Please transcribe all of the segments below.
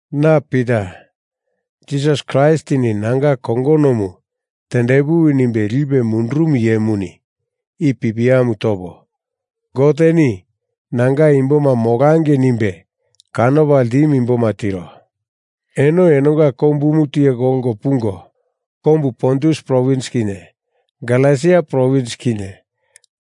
Na Pita, Jisas Kraistini nanga kongonomu tendepuwi nimbe lipe mundurumu iyemuni i pipiamu topo, Goteni nanga imboma molangei nimbe kanopa ltimu imboma tiro. Eno enonga kombumu tiye kolko pungo, kombu Pontus provins kinye Galesia provins kinye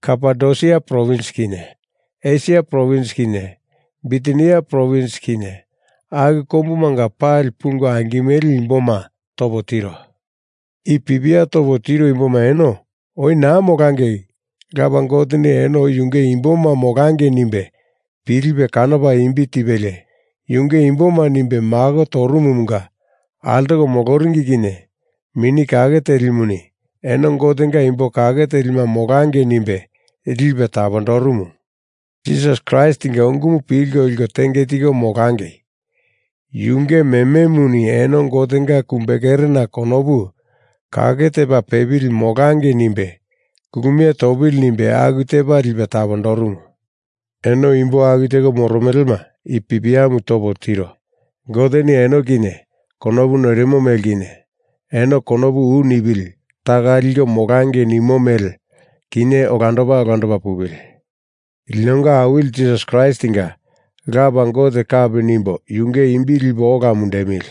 Kapadosia provins kinye Esia provins kinye Bitinia provins kinye, aku kombumanga pali pungo angimele imboma topo tiro. I pipia topo tiro imboma eno oi naa molangei Lapa Goteni eno oi Yunge imboma molangei nimbe pilipe kanopa imbi tipelie Yunge imboma nimbe mako torumumunga altoko moloringi kinye Mini Kake Telimuni eno Gotenga imbo kake telima molangei nimbe lipe tapondorumu. Jisas Kraistinga ungumu pilko liko tenge tiko molangei. Yunge mememuni eno Gotenga kumbekerena konopu kake tepa pepili molangei nimbe kulumie topili nimbe aku tepa lipe tapondorumu. Eno imbo aku teko moromelema i pipiamu topo tiro. Goteni eno kinye konopu noirimo mele kinye, eno konopu u nipili taka liko molangei nimo mele kinye olandopa olandopa pupili. Linonga Awili Jisas Kraistinga Lapa Gote kapi nimbo yunge imbi lipo ola mundemili.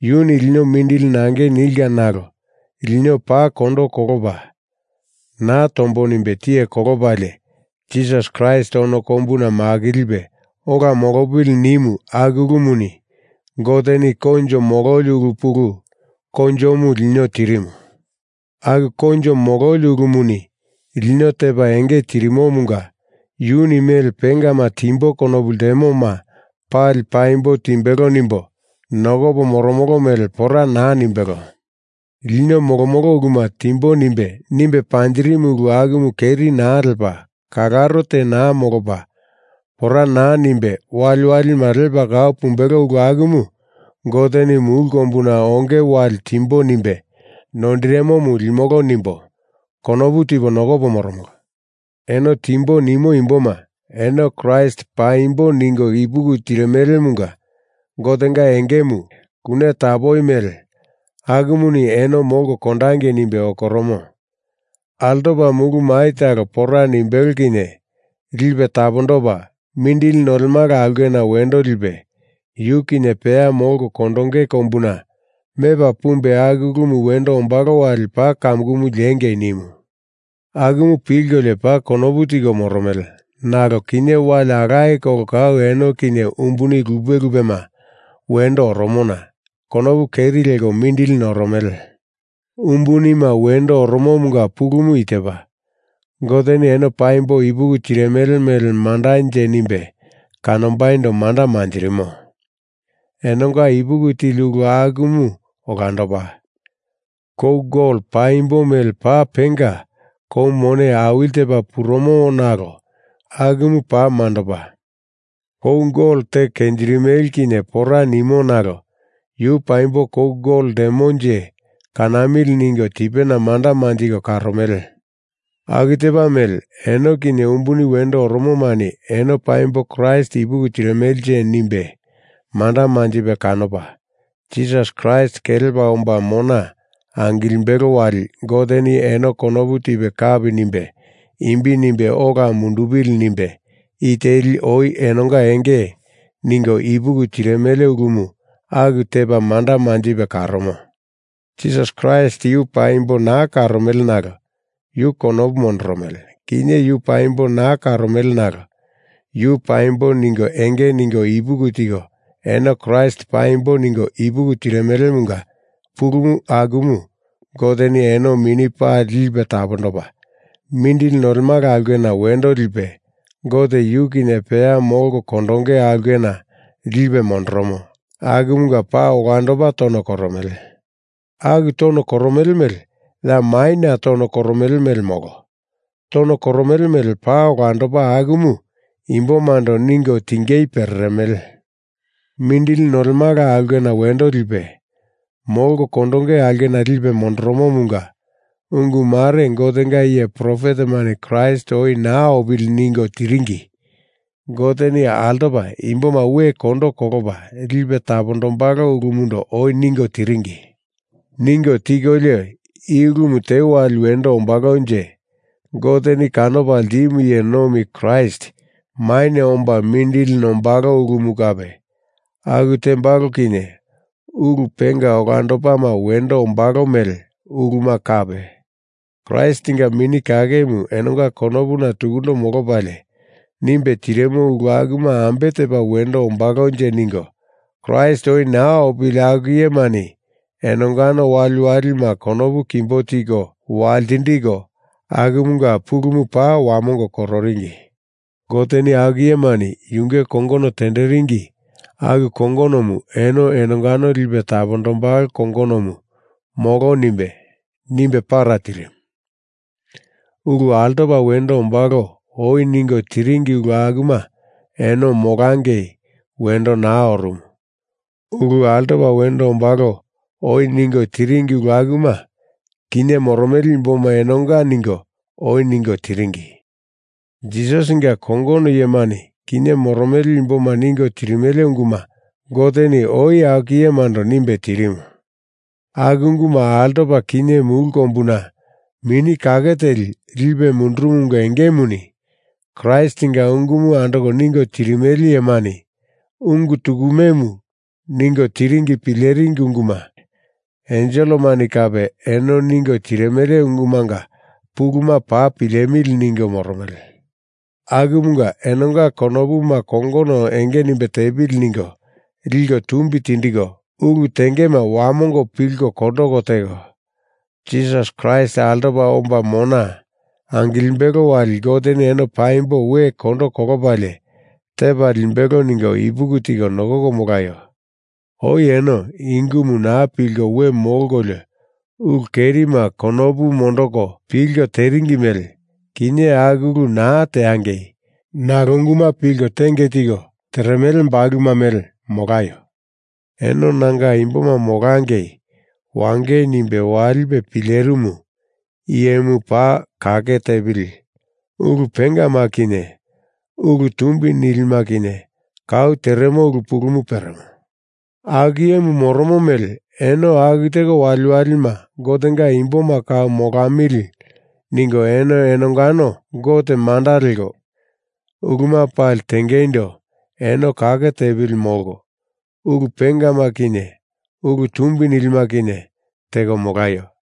Yuni lino mindili nangei nilka nalo lino paa kondo kolopa naa tombo nimbe tiye kolopalie Jisas Kraist ono kombuna makilipe ola molopili nimu aku ulumuni Goteni koinjo mololi ulu pulu koinjomu lino tirimu. Aku koinjo mololi ulumuni lino tepa enge tirimomunga Yuni mele pengama timbo konopu ltemoma pali paimbo timbelo nimbo nokopo moromolo mele pora naa nimbelo. Lino molomolo uluma timbo nimbe, nimbe panjirimu ulu akumu keri naa lepa, kalaro te naa molopa, pora naa nimbe waliwalima lepa kau pumbelo ulu akumu Goteni mulu kombuna onge wali timbo nimbe noindirimomu limolo nimbo, konopu tipo nokopo moromolo. Eno timbo nimo imboma, eno Kraist paimbo ningo ipuki tirimelemunga Gotenga engemu, kune tapoi mele, akumuni eno molko kondangei nimbe okoromo. Altopa mulu mai talo pora nimbelo kinye lipe tapondopa, mindili nolemala aulkena wendo lipe, yu kinye peya molko kondonge kombuna mepa pumbe aku ulumu wendo ombalo wali paa kamukumu liengei nimu. Akumu pilkolio paa konopu tiko moromele, nalo kinye wali alaye kolo kau eno kinye umbuni lupe lupema wendo oromona konopu keri leko mindili noromele. Umbunima wendo oromomunga pulumu i tepa: Goteni eno paimbo ipuki tirimele mele mandanje nimbe kanombaindo manda manjirimo. Enonga ipuki tili ulu akumu olandopa. Kou gol paimbo mele paa penga kou mone awili tepa purumo nalo akumu paa mandopa. Kou golomu teko kenjirimele kinye pora nimo nalo yu paimbo kou gol ltemonje, kanamili ningo tipena manda manjiko karomele. Aku tepa mele, eno kinye umbuni wendo oromomani eno paimbo Kraist ipuki tirimelenje nimbe manda manjipe kanopa, Jisas Kraist kelepa omba mona angilimbelo wali Goteni eno konopu tipe kapi nimbe imbi nimbe ola mundupili nimbe i teli oi enonga enge ningo ipuki tirimele ulumu aku tepa manda manjipe karomo. Jisas Kraist yu paimbo naa karomele nalo Yu konopu mondoromele. Kinye yu paimbo naa karomele nalo Yu paimbo ningo enge ningo ipuki tiko eno Kraist paimbo ningo ipuki tirimelemunga pulu akumu Goteni eno mini pali lipe tapondopa, mindili nolemala aulkena wendo lipe, Gote yu kinye peya molko kondonge aulkena lipe mondoromo, akumunga paa olandopa tono koromele. Aku tono koromele mele ya maina tono koromele mele molo. Tono koromele mele paa olandopa akumu imbomando ningo tingei pereremele. Mindili nolemala aulkena wendo lipe, molko kondonge aulkena lipe mondoromomunga ungu mare Gotenga iye profetemani Kraist oi naa opili ningo tiringi. Goteni altopa imboma we kondo kolopa lipe tapondombalo ulumundo oi ningo tiringi. Ningo tikolio, i ulumu te wali wendo ombalonje, Goteni kanopa ltimu iye nomi Kraist maina omba mindili nombalo ulumu kape, aku tembalo kinye ulu penga olandopama wendo ombalo mele uluma kape, Kraistinga Mini Kakemu enonga konopuna tukundo molopalie nimbe tirimu ulu akuma ambe tepa wendo ombalonje ningo Kraist oi naa opili aku iyemani enongano waliwalima konopu kimbo tiko waltindiko, akumunga pulumu paa wamongo kororingi. Goteni aku iyemani yunge kongono tenderingi aku kongonomu eno enongano lipe tapondombalo kongonomu molo nimbe, nimbe para tirimu. Ulu altopa wendo ombalo oi ningo tiringi ulu akuma eno molangei wendo naa orumu. Ulu altopa wendo ombalo oi ningo tiringi ulu akuma, kinye moromele imboma enonga ningo, oi ningo tindiringi. Jisasinga kongono iyemani kinye moromele imboma ningo tirimele unguma Goteni oi aku iyemando nimbe tirimu. Aku unguma altopa kinye mulu kombuna Mini Kake Teli lipe mundurumumunga engemuni Kraistinga ungumu andoko ningo tirimele iyemani ungu tukumemu ningo tiringina pileringi unguma. Enselemani kape eno ningo tirimele ungumanga puluma paa pilemili ningo moromele. Akumunga enonga konopuma kongono enge nimbe tepili ningo liko tumbi tindiko, ulu tengema wamongo pilko kondoko teko, Jisas Kraist altopa omba mona angilimbelo wali Goteni eno paimbo we kondo kolopalie tepa limbelo ningo ipuki tiko nokoko molaio. Oi eno i ungumu naa pilko we molkolio ulu kerima konopu mondoko pilko teringi mele kinye aku ulu naa teangei nalo unguma pilko tenge tiko teremele bakuluma mele molaio. Eno nanga imboma molangei wangei nimbe walipe pilerimu iyemu paa kake tepili ulu pengama kinye ulu tumbi nilima kinye kau teremo ulu pulumu peremo. Aku iyemu moromo mele eno aku teko waliwalima Gotenga imboma kau molamili ningo eno enongano Gote manda leko, uluma pali tengeindo eno kake tepili molko, ulu pengama kinye ulu tumbi nilima kinye teko molaio.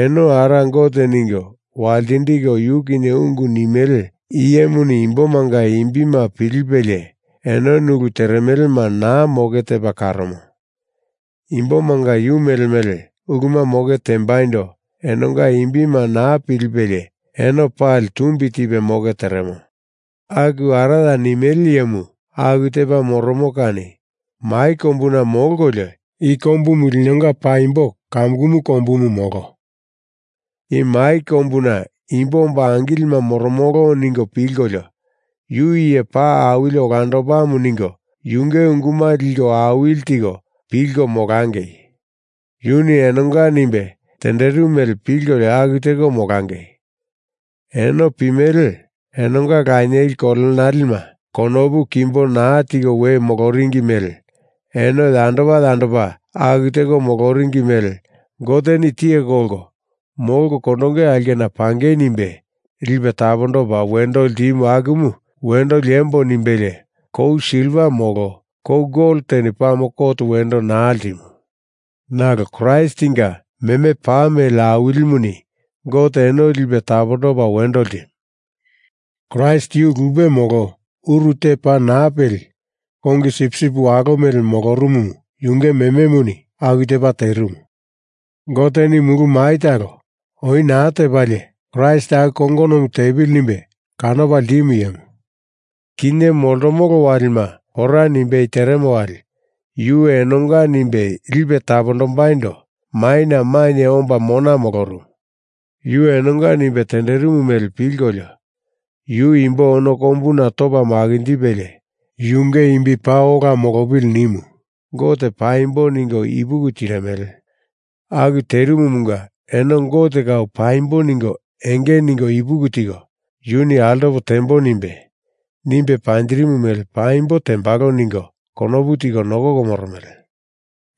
Eno Ara Gote ningo waltindiko Yu kinye ungu nimele iyemuni imbomanga imbima pilipelie enoni ulu teremelema naa moke tepa karomo. Imbomanga yu mele mele uluma moke tembaindo enonga imbima naa pilipelie eno pali tumbi tipe moke teremo. Aku Araya nimele iyemu aku tepa moromo kani mai kombuna molkolio i kombumu linonga paimbo kamukumu kombumu molo. I mai kombuna imbo omba angilima moromolo ningo pilkolio Yu iye paa awili olandopamu ningo yunge unguma liko awili tiko pilko molangei. Yuni enonga nimbe tenderimu mele pilkolio aku teko molangei. Eno pimele, enonga lanieli kolenalema konopu kimbo naa tiko we moloringi mele eno yandopa yandopa aku teko moloringi mele Goteni tiye kolko molko kondonge aulkena pangei nimbe lipe tapondopa wendo ltimu akumu wendo liembo nimbelie kou silva molo kou gol teni pame kot wendo naa ltimu. Nalo Kraistinga meme paa mele awilimuni Goteni eno lipe tapondopa wendo ltimu. Kraist yu lupe molo uru te paa naa peli kongi sipsip walo mele molorumumu, yunge mememuni aku tepa terimu. Goteni mulu mai talo oi naa tepalie Kraist aku kongonomu tepili nimbe kanopa ltimu iyemu, kinye moltomolo walima pora nimbei teremo wali yu enonga nimbe lipe tapondombaindo maina mainye omba mona molorumu. Yuni enonga nimbe tenderimu mele pilkolio Yu imbo ono kombuna topa makinjipelie Yunge imbi paa ola molopili nimu Gote paimbo ningo ipuki tirimele. Aku terimumunga eno Gote kau paimbo ningo enge ningo ipuki tiko, Yuni altopo tembo nimbe, nimbe panjirimu mele paimbo tembalo ningo konopu tiko nokoko moromele.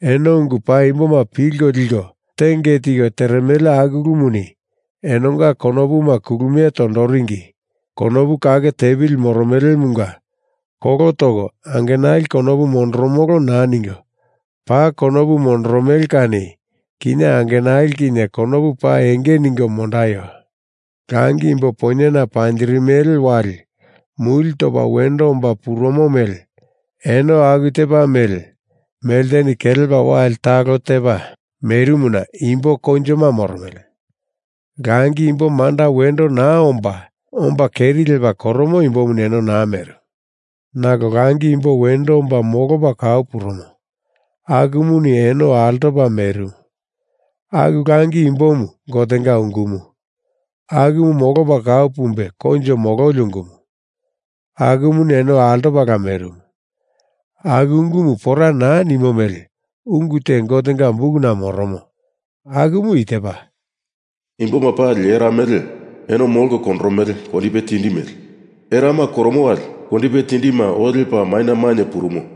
Eno ungu paimboma pilko liko tenge tiko teremele aku ulumuni enonga konopuma kulumie tondoringi, konopu kake tepili moromelemunga kolo toko angenali konopu mondoromolo naa ningo, paa konopu mondoromele kani kinye angenali kinye konopu paa enge ningo mondaio. Langi imbo poinyena panjirimele wali muli topa wendo omba purumo mele eno aku tepa mele melteni kelepa wali talo tepa merimuna imbo koinjoma moromele. Langi imbo manda wendo naa omba, omba keri lepa koromo imbomuni eno naa merimu. Nalo langi imbo wendo omba molopa kau purumo akumuni eno altopala merimu. Aku langi imbomu Gotenga ungumu, akumu molopa kau pumbe koinjo mololi ungumu. Akumuni eno altopala merimu. Aku ungumu pora naa nimo mele ungu te Gotenga bukuna moromo, akumu i tepa: Imboma pali era mele, eno molko kondoromele kondipe tindi mele. Erama koromo wali kondipe tindima oo lepa maina mainye purumo